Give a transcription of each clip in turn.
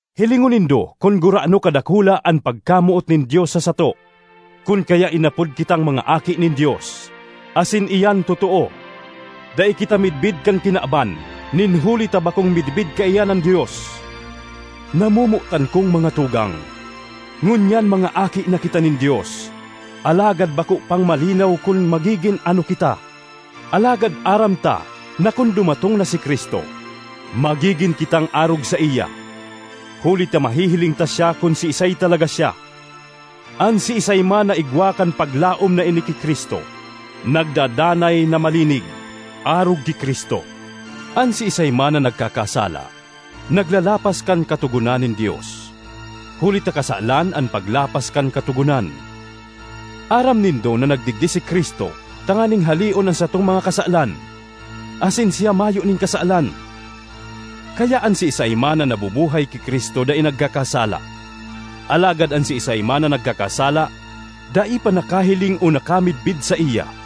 Hilingon nindo kun gurano kadakula an pagkamoot nin Dios sa sato, kun kaya inapod kitang mga aki nin Dios, asin iyan totoo. Dai kita midbid kan kinaban nin huli ta bakong midbid kaiyan an Dios. Namomotan kong mga tugang, ngunyan mga aki na kita nin Dios, alagad bako pang malinaw kun magigin ano kita. Alagad aram ta na kun dumatong na si Cristo, magigin kitang arog saiya, huli ta mahihiling ta siya kun siisay talaga siya. An siisay man na igwa kan paglaom na ini ki Cristo nagdadanay na malinig, arog ki Cristo. An siisay man na nagkakasala, naglalapas kan katogonan nin Dios, huli ta kasalan an paglapas kan katogonan. Aram nindo na nagdigdi si Cristo tanganing haleon an satong mga kasalan; asin siya mayo nin kasalan. Kaya an siisay man na nabubuhay ki Cristo dai nagkakasala; alagad an siisay man na nagkakasala, dai pa nakahiling o nakamidbid saiya.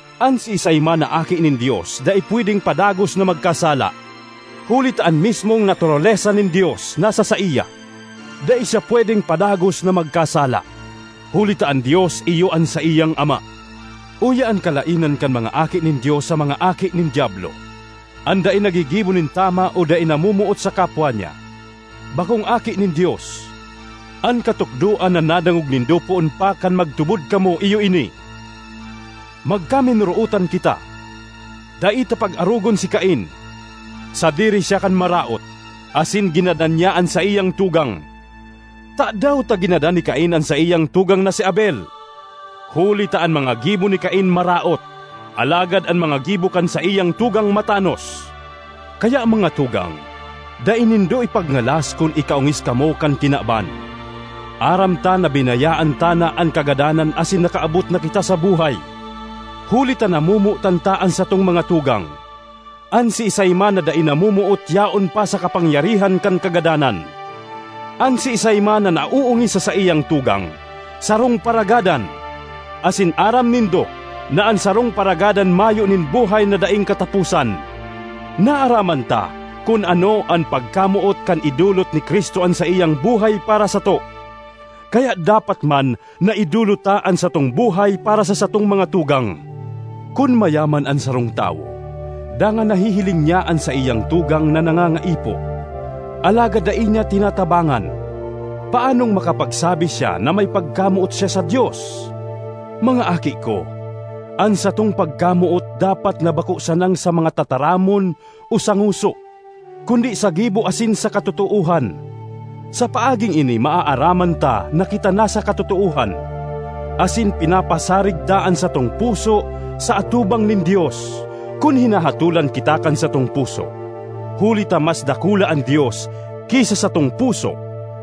An siisay man na aki nin Dios dai pwedeng padagos na magkasala, huli ta an mismong naturalesa nin Dios nasa saiya; dai siya pwedeng padagos na magkasala, huli ta an Dios iyo an saiyang Ama. Uya an kalaenan kan mga aki nin Dios sa mga aki nin diablo: an dai naggigibo nin tama o dai namomoot sa kapwa niya, bakong aki nin Dios. An katukdoan na nadangog nindo poon pa kan magtubod kamo iyo ini: magkaminorootan kita. Dai ta pag-arogon si Cain; sadiri siya kan Maraot, asin ginadan niya an saiyang tugang. Tadaw ta ginadan ni Cain an saiyang tugang na si Abel? Huli ta an mga gibo ni Cain maraot, alagad an mga gibo kan saiyang tugang matanos. Kaya, mga tugang, dai nindo ipagngalas kun ikaongis kamo kan kinaban. Aram ta na binayaan ta na an kagadanan asin nakaabot na kita sa buhay, huli ta namomotan ta an satong mga tugang. An siisay man na dai namomoot yaon pa sa kapangyarihan kan kagadanan. An siisay man na naoongis sa saiyang tugang, sarong paragadan, asin aram nindo na an sarong paragadan mayo nin buhay na daing kataposan. Naaraman ta kun ano an pagkamoot kan idolot ni Cristo an saiyang buhay para sato. Kaya dapat man na idolot ta an satong buhay para sa satong mga tugang! Kun mayaman an sarong tawo, dangan nahihiling niya an saiyang tugang na nangangaipo, alagad dai niya tinatabangan, paanong makapagsabi siya na may pagkamoot siya sa Dios? Mga aki ko, an satong pagkamoot dapat na bako sanang sa mga tataramon o sa ngoso, kundi sa gibo asin sa katotoohan. Sa paaging ini maaraman ta na kita nasa katotoohan, asin pinapasarig ta an satong puso sa atubang nin Dios, kun hinahatolan kita kan satong puso; huli ta mas dakula an Dios ki sa satong puso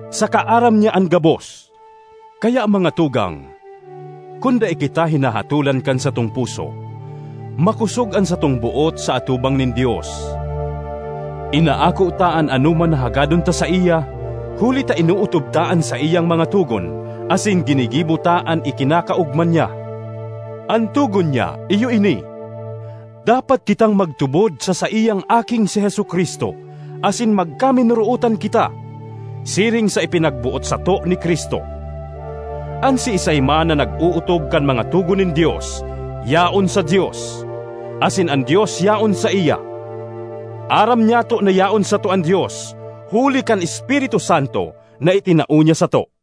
saka aram niya an gabos. Kaya, mga tugang, kun dai kita hinahatolan kan satong puso, makosog an satong boot sa atubang nin Dios. Inaako ta an anoman na hagadon ta saiya, huli ta inootob ta an saiyang mga togon asin ginigibo ta an ikinakaogma niya. An togon niya iyo ini: dapat kitang magtubod sa saiyang Aking si Jesu-Cristo asin magkaminorootan kita, siring sa ipinaboot (ipinagboot) sato ni Cristo. An siisay man na nag-ootob kan mga togon nin Dios, yaon sa Dios, asin an Dios yaon saiya. Aram nyato na yaon sato an Dios huli kan Espiritu Santo na itinao niya sato.